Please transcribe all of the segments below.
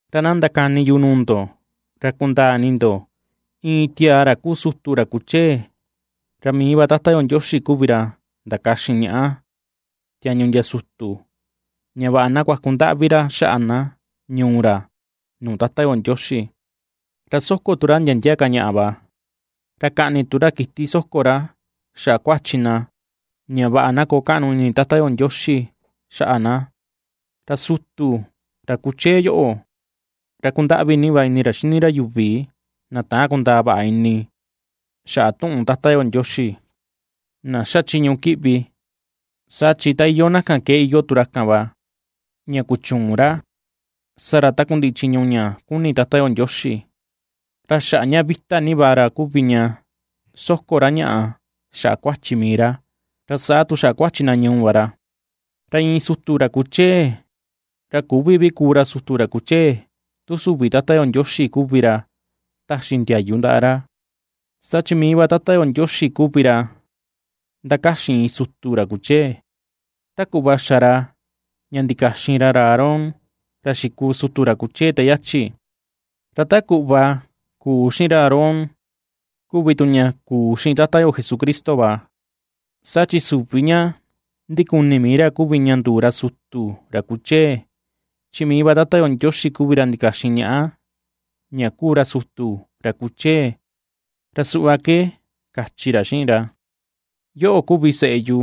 Ra na ndakani yu nuu ndo ra kundaa ini ndo: Iin tiaa, ra kuu sutu, ra kuchee, ra mii va Tata yo Ndioxi kuvi ra ndakaxin ñaꞌa tiañu ndia sutu, ña vaꞌa na kuaku ndaꞌvi ra xaꞌa na ñuu ra nuu Tata yo Ndioxi, ra soko tu ra ndia ndia ka ñaꞌa va, ra kaꞌni tu ra kiti soko ra xaꞌa kuachi na ña vaꞌa na koo kaꞌnu ini Tata yo Ndioxi xaꞌa na. Ra sutu, ra kuchee yoꞌo, ra kundaꞌvi va ini ra xini ra yuvi na täan kundäa vaꞌa ini xaꞌa tuꞌun Tata yo Ndioxi, na xa chiñu kiꞌvi, saa chi ta iyoo na kan ke iyoo tu ra kan va, ña kuchüun ra sa ra takundiꞌi chiñu ña kuni Tata yo Ndioxi. Ra xaꞌa ña vita ni va ra kuvi ña soko ra ñaꞌa xaꞌa kuachi mii ra, ra saa tu xaꞌa kuachi na ñuu va ra. Ra iin sutu ra kuchee, ra küvi vi kuu ra sutu ra kuchee tu süvi Tata yo Ndioxi kuvi ra taxi ndiayu ndaꞌa ra; saa chi mii va Tata yo Ndioxi kuvi ra ndakaxin iin sutu ra kuchee, ta kuꞌva xa ra ña ndikaxin ra ra Aarón, ra xikuu sutu ra kuchee te yachi. Ra ta kuꞌva kuu xiꞌin ra Aarón, kuvi tu ña kuu xiꞌin Tata yo Jesucristo va; Saa chi süvi ña ndikuni mii ra kuvi ña nduu ra sutu ra kuchee, chi mii va Tata yo Ndioxi kuvi ra ndikaxin ñaꞌa ña kuu ra sutu ra kuchee, ra suꞌva ke kachi ra xiꞌin ra: Yoꞌo kuvi seꞌe yu;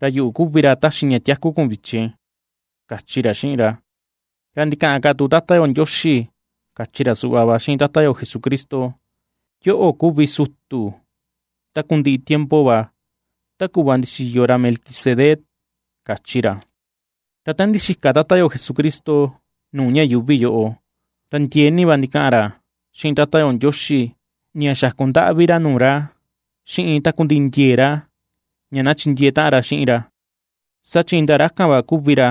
ra yuꞌu kuvi ra taxi ña tiaku kun vichin, kachi ra xiꞌin ra. Ra ndikaꞌan ka tu Tata yo Ndioxi kachi ra suꞌva va xiꞌin Tata yo Jesucristo: Yoꞌo kuvi sutu takundiꞌi tiempo va, ta kuꞌva ndixiyo ra Melquisedec, kachi ra. Ra ta ndixika Tata yo Jesucristo nuu ñuꞌu yuuvi yóꞌo, ra ndiee ni va ndikaꞌan ra xiꞌin Tata yo Ndioxi ña xaku ndaꞌvi ra nuu ra, xiꞌin takundiꞌi ndiee ra ña na chindiee taꞌan ra xiꞌin ra, saa chi indaa ra kan va kuvi ra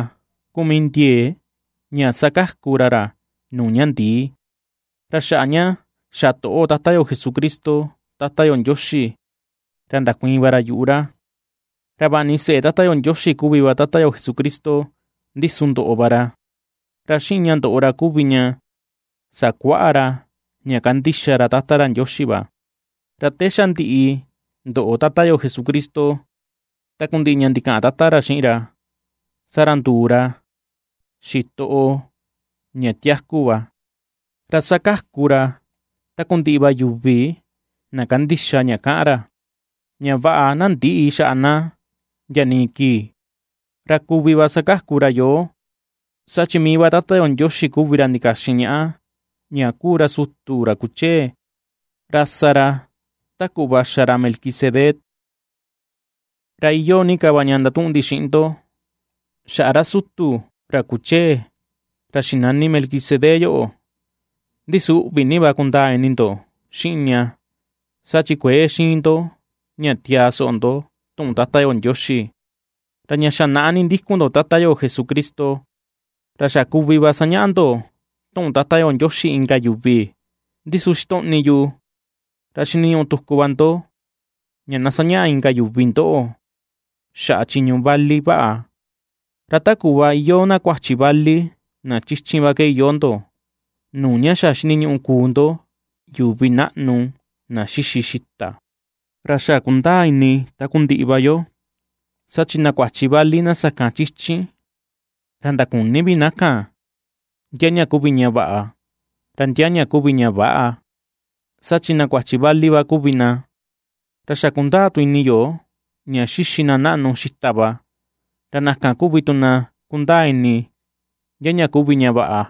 kuu mii ndiee ña sakaku ra ra nuu ña ndii; ra xaꞌa ña xa toꞌo Tata yo Jesucristo Tata yo Ndioxi, ra ndakuiin va ra yuꞌu ra. Ra vaꞌa ni seꞌe Tata yo Ndioxi kuvi va Tata yo Jesucristo, ndi su ndoꞌo va ra, ra xiꞌin ña ndoꞌo ra kuvi ña sakuaꞌa ra ña kandixa ra Tata ra Ndioxi va. Ra te xa ndiꞌi ndoꞌo Tata yo Jesucristo takundiꞌi ña ndikaꞌan Tata ra xiꞌin ra, saa ra nduu ra xitoꞌo ña tiaku va, ra sakaku ra takundiꞌi va yuvi na kandixa ña kaꞌan ra, ña vaꞌa na ndïꞌi xaꞌa na ndia nii kii. Ra kuvi va sakaku ra yoo, saa chi mii va Tata yo Ndioxi kuvi ra ndikaxin ñaꞌa, ña kuu ra sutu, ra kuchee, ra sa ra ta kuꞌva xa ra Melquisedec. Ra iyoo ni ka va ña ndatuꞌun ndi xiꞌin ndo xaꞌa ra sutu ra kuchee, ra xinani Melquisedec yoꞌo, ndi su uꞌvi ni va kundaa ini ndo xiꞌin ña saa chi kuëe xiin ndo ña tiaa soꞌo ndo tuꞌun Tata yo Ndioxi. Ra ña xa naꞌa ndikun ndo Tata yo Jesucristo, ra xa kuvi va sañaꞌa ndo tuꞌun Tata yo Ndioxi inka yuvi, ndi su xitoꞌni yu, ra xiniñuꞌu tuku va ndo ña na sañaꞌa inka yuvi ndoꞌo xaꞌa chiñu ña vali vaꞌa. Ra ta kuꞌva iyoo na kuachi vali na chichin va ke iyoo ndo, nuu ña xa xiniñuꞌu kuu ndo yuvi naꞌnu na xixi xita. Ra xa kundaa ini takundiꞌi va yo, saa chi na kuachi vali na sakan chichin ra ndaküni vi na kan, ndia ña kuvi ña vaꞌa, ra ndia kuvi ña väꞌa, saa chi na kuachi vali va kuvi na. Ra xa kundaa tu ini yo ña xixi na naꞌnu xita va, ra na kan kuvi tu na kundaa ini ndia ña kuvi ña vaꞌa,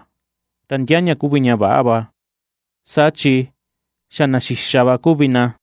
ra ndia ña kuvi ña väꞌa va, saa chi xa na xixa va kuvi na.